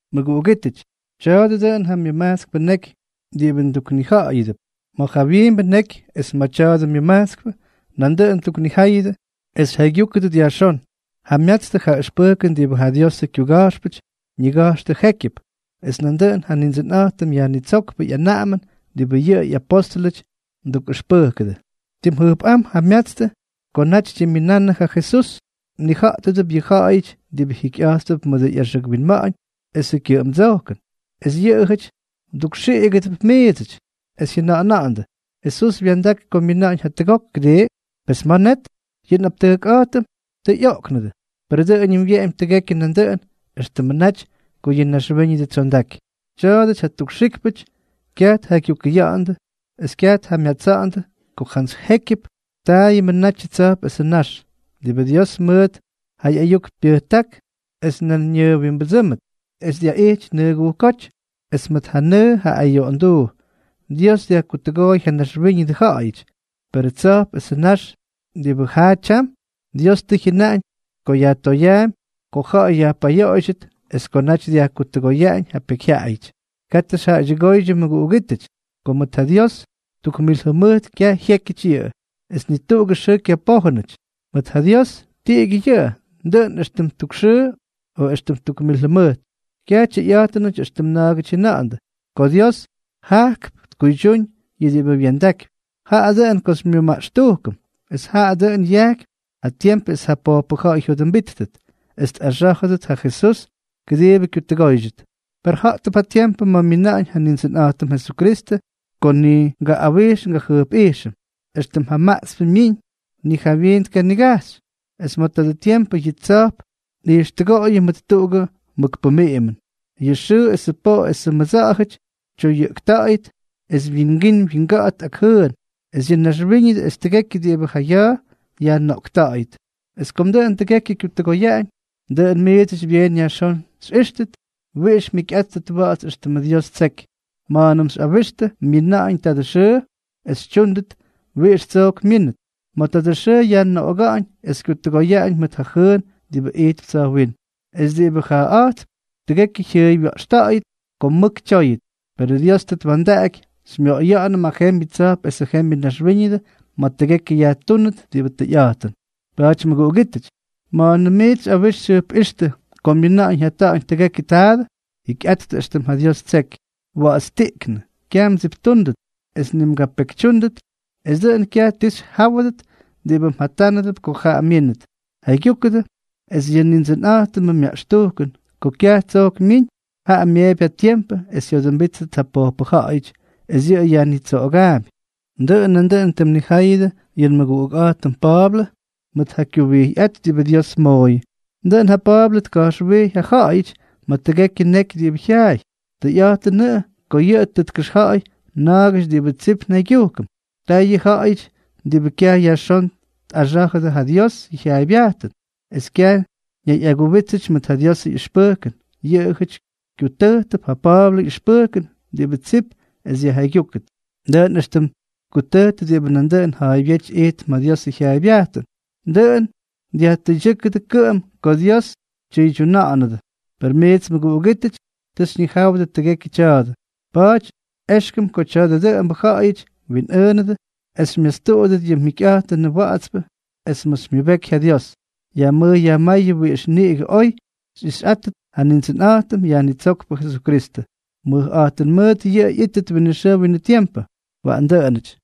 Mʉguꞌugítʉty, tya̱a̱dʉ dʉꞌʉn ja myʉmajtskpʉ neky diꞌibʉ nduknija̱ꞌa̱yʉdʉp. Ma̱ ja jawyiimbʉ neky es ma̱ tya̱dʉ myʉmajtskpʉ nandʉꞌʉn nduknijáyʉdʉ es xyja̱ꞌa̱ygyúkʉdʉt yajxón. Jamyatstʉ ja ʉxpʉjkʉn diꞌibʉ ja Diosʉ kyuga̱jxpʉty ñiga̱jxtʉ jékyʉp; es nandʉꞌʉn ja Nindsʉnꞌa̱jtʉm Yajnitsókpʉ ꞌyanaꞌamʉn diꞌibʉ yʉ ꞌyapóstʉlʉty mdukꞌʉxpʉjkʉdʉ. Tim jʉjpꞌám jamyatstʉ ko naty tyimminannʉ ja Jesús, mnija̱ꞌtʉdʉp yʉ ja̱ꞌa̱yʉty diꞌibʉ jikyꞌa̱jttʉp mʉdʉ ꞌyaxʉk winma̱ꞌa̱ñ esʉ kyʉꞌʉmdsojkʉn, es yʉꞌʉjʉty mdukxiꞌigʉdʉp miidsʉty es jyʉna̱ꞌa̱na̱ꞌa̱ndʉ: “Jesús wya̱ndak ko myina̱ꞌa̱ñ jatʉgok, ¿kʉdii? Pes, ¿ma̱ net? Yʉ nꞌaptʉjkꞌa̱jtʉm tʉ ꞌyoꞌknʉdʉ, per dʉꞌʉñʉm wyeꞌemy tʉgekyʉ nandʉꞌʉn éxtʉmʉ naty ko yʉ naxwíñʉdʉ tsyondaky.” Tya̱a̱dʉty ja tukxíkpʉty kyaj tjaygyukʉya̱ꞌa̱ndʉ es kyaj tjamyatsa̱ꞌa̱ndʉ ko jantsy jékyʉp taayʉmʉ natyʉ tsa̱jp esʉ nax, diꞌibʉ Dios mʉt ja ꞌyayuk pyʉjták esʉ nan ñʉʉwimbʉdsʉ́mʉt, es dyaꞌity nʉʉgujkóty, es mʉt ja nʉʉ, ja ayoꞌonduu, Dios dyajkutʉgooy ja naxwíñʉdʉ ja̱ꞌa̱yʉty. Perʉ tsa̱jp esʉ nax diꞌibʉ jaa tyam, Dios tʉ jyʉnaꞌañ ko yajtoyaampy ko ja̱ꞌa̱y yajpayoꞌoydyʉt es ko naty dyajkutʉgoyaꞌañ ja pekyjyaꞌayʉty. Katʉ xyjaꞌaydyʉgóydyʉ mʉguꞌugítʉty, ko mʉt ja Dios tuk mil jʉmʉjt kyaj jyékyʉty yʉꞌʉ, es ni tuꞌugʉ xʉʉ kyapójʉnʉty. Mʉt ja Dios, tiꞌigyʉ yʉꞌʉ, dʉꞌʉn éxtʉm tuk xʉʉ o éxtʉm tuk mil jʉmʉjt. Kyaj tyʉyꞌa̱jtʉnʉty éxtʉm na̱a̱gʉty jyʉna̱ꞌa̱ndʉ, ko Dios jajkp tkuydyúñ yʉ diꞌibʉ wya̱ndakypy. Jaꞌa dʉꞌʉn ko xymyʉmaꞌxtujkʉm, es jaꞌa dʉꞌʉn yajkypy ja tiempʉ es ja pojpʉ ja̱ꞌa̱y jyodʉmbíttʉt, es tꞌaxá̱jʉdʉt ja Jesús, kʉdiibʉ kyutʉgóydyʉt. Per ja̱ꞌtʉp ja tiempʉ ma̱ myina̱ꞌa̱ñ ja Nindsʉnꞌa̱jtʉm Jesukristʉ ko ni ngaꞌꞌawijx ngajʉjpꞌijxʉm, éxtʉm ja maꞌtspʉ myiñ ni jawyiin tkanigajxy. Es ma̱ tadʉ tiempʉ yʉ tsa̱jp nꞌijxtʉgoꞌoyʉm mʉt tuꞌugʉ mʉk pʉmiꞌimʉn. Yʉ xʉʉ esʉ poꞌo esʉ mʉdsa̱ꞌa̱jʉty tyoyʉꞌkta̱ꞌa̱yʉt, es wyingín wyinga̱ꞌa̱t ak jʉʉn, es yʉ naxwíñʉdʉ es tʉgekyʉ diꞌibʉ ja ya̱a̱ yajnoꞌkta̱ꞌa̱yʉt. Es kom dʉꞌʉn tʉgekyʉ kyutʉgoyaꞌañ, dʉꞌʉn miidsʉty byeen yajxón xyꞌíxtʉt wiꞌix mjikyꞌáttʉt wa̱ꞌa̱ts es éxtʉmʉ Dios ttseky ma̱a̱nʉm xyꞌawixtʉ myina̱ꞌa̱ñ tadʉ xʉʉ, es xytyúndʉt wiꞌix tsojk myínʉt. Ma̱ tadʉ xʉʉ yajnoꞌoga̱ꞌa̱ñ es kyutʉgoyaꞌañ mʉt ja jʉʉn diꞌibʉ ijtp tsa̱jwínm, es diꞌibʉ jaaꞌa̱jtp, tʉgekyʉ jyʉʉywya̱ꞌxta̱ꞌa̱yʉt ko mʉk tyóyʉt. Perʉ Dios tʉ twa̱ndaꞌaky xymyoꞌoya̱ꞌa̱nʉm ja jembyʉ tsa̱jp esʉ jembyʉ naxwíñʉdʉ ma̱ tʉgekyʉ yajtúnʉt diꞌibʉ tʉyꞌa̱jtʉn. Pa̱a̱ty mʉguꞌugítʉty, ma̱a̱nʉm miits xyꞌawix xyjʉjpꞌíxtʉ ko myina̱ꞌa̱ñ jyata̱ꞌa̱ñ tʉgekyʉ taadʉ, jikyꞌattʉ éxtʉm ja Dios ttseky, wa̱ꞌa̱tstiꞌknʉ, kyaj mdsiptúndʉt, es ni mgapekytyúndʉt, es dʉꞌʉn kyaj ti xyjáwʉdʉt diꞌibʉ mjatánʉdʉp ko jaꞌa myínʉt. Jaygyúkʉdʉ, es yʉ Nindsʉnꞌa̱jtʉmʉ myaꞌxtujkʉn ko kyaj tsojk myiñ, jaꞌa myeepy ja tiempʉ es jyodʉmbíttʉt ja pojpʉ ja̱ꞌa̱yʉty, es yʉꞌʉ yajnitsoꞌogaampy. Dʉꞌʉn nandʉꞌʉn tim mnijáyʉdʉ yʉ nmʉguꞌukꞌa̱jtʉm Pa̱a̱blʉ mʉt ja kyuwijyꞌát diꞌibʉ Dios mooyʉ. Dʉꞌʉn ja Pa̱a̱blʉ tka̱jxwijy ja ja̱ꞌa̱yʉty ma̱ tʉgekyʉ ñeky diꞌibʉ jyaay. Tʉyꞌa̱jtʉnʉꞌʉ ko yʉꞌʉ tʉ tkʉxja̱ꞌa̱y na̱a̱gʉty diꞌibʉ tsip njaygyujkʉm. Taa yʉ ja̱ꞌa̱yʉty diꞌibʉ kyaj yajxón tꞌaxá̱jʉdʉ ja Diosʉ jyaaybyajtʉn, es kyaj ñayꞌaguwítsʉdʉ mʉt ja Diosʉ ꞌyʉxpʉjkʉn, yʉꞌʉjʉty kyutʉjtʉp ja Pa̱a̱blʉ ꞌyʉxpʉjkʉn diꞌibʉ tsip es yajjaygyúkʉt, dʉꞌʉn éxtʉm tkutʉjtʉ diꞌibʉ nandʉꞌʉn jaybyety ijtp ma̱ Diosʉ jyaaybyajtʉn. Dʉꞌʉn dyajtʉydyʉ́kʉdʉ kʉꞌʉm ko Dios tyʉydyuna̱ꞌa̱nʉdʉ. Per miits mʉguꞌugítʉty, tʉ xyñijáwʉdʉ tʉgekyʉ tya̱a̱dʉ. Pa̱a̱ty éxkʉm ko tya̱dʉ dʉꞌʉmbʉ ja̱ꞌa̱yʉty mwinꞌʉʉnʉdʉ es xymyastuꞌudʉt yʉ mjikyꞌa̱jtʉnʉ wa̱ꞌa̱tspʉ es ma̱ xymyʉbeky ja Dios. Yajmʉj yajmáyʉdʉ wiꞌix niꞌigʉ oy xyꞌixꞌáttʉt ja Nindsʉnꞌa̱jtʉm Yajnitsókpʉ Jesukristʉ. Mʉjꞌa̱jtʉn mʉʉt yʉꞌʉ ꞌyítʉt winʉ xʉʉ winʉ tiempʉ. Waꞌan dʉꞌʉnʉty.